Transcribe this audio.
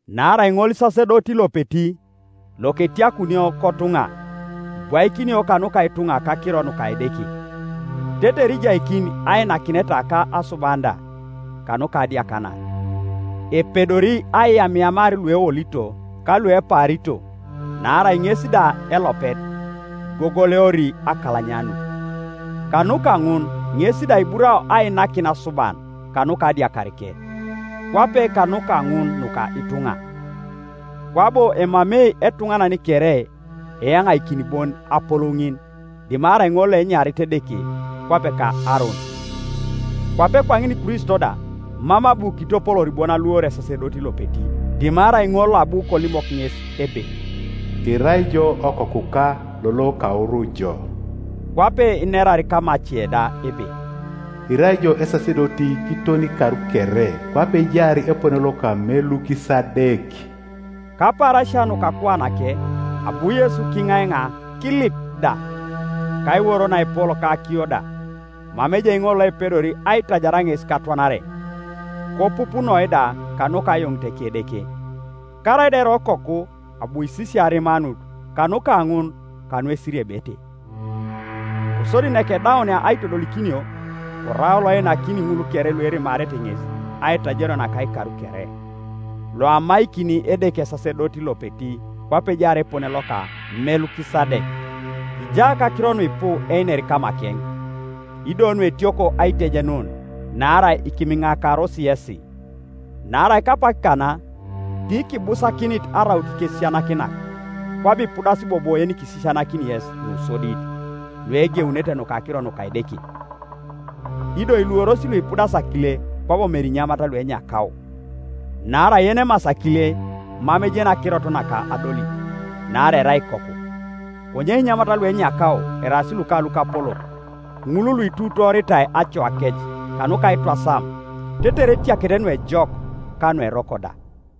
Naarai ŋolisasedoti lopeti loketiakunio kotuŋa ibwaikinio kanuka ituŋa kakiro nuka Edeke, tetere ijaikini ainakineta ka asuban da kanuka adiakanar. Epedori aiyamiyamar lueolito ka luepaarito, naarai ŋes da elopet igogoleori akalanyanut. Kanuka ŋun ŋes da iburao ainakin asuban kanuka adiakarike, kwape kanuka ŋun nuka ituŋa. Kwabo emamei etuŋanan kere eyaŋaikin bon apolou ŋin, dimarai ŋol loenyarit Edeke, kwape ka Aaron. Kwape kwaŋin Kristo da mam abu kitopoloor bon aluor esasedoti lopeti, dimarai ŋol loabu kolimok ŋes ebe, “Irai ijo Okokuka, lolo kauru jo.” Kwape inerar kamace da ebe, “Irai ijo esasedoti kiton ikar kere, Kwape ejaar epone loka Melukisadek.” Kapaarasia nuka akuanake, abu Yesu kiŋaiŋa kilip da, kaiworo naepol ka akiyo da, mama ejai ŋol loepedori aitajar ŋes katwanare, kopupunoi da kanuka ayoniteke Edeke. Karaida kerai Okoku abu kisisia arimanut kanuka ŋun kanuesiriebete; kosodi nakedaunia aitodolikinio, korau loeinakini ŋul kere luerimarete ŋes aitajario naka ikar kere, loamaikini Edeke esasedoti lopeti kwape ejaar epone loka Melukisadek. Kija kakiro nuipu einer kamakeŋ, ido nuetioko aitejenun, naarai ikimiŋakaros yesi. Naarai kapak kana tikibusakinit araut ikesisianakinak, kwabo ipudasi bobo yenikisisianakini yes nusodit nuegeunete nuka akiro nuka Edeke. Ido iluoros luipudasi akile kwabo mere inyamat luenyakao. Naarai yenemasi akile mam ejeni akirot naka adolit, naarai erai ikoku. Konye inyamat luenyakao eraas luka lukapolok, ŋul luiruutooritai acoakec kanuka aitwasam, tetere etiakete nuejok ka nueroko da.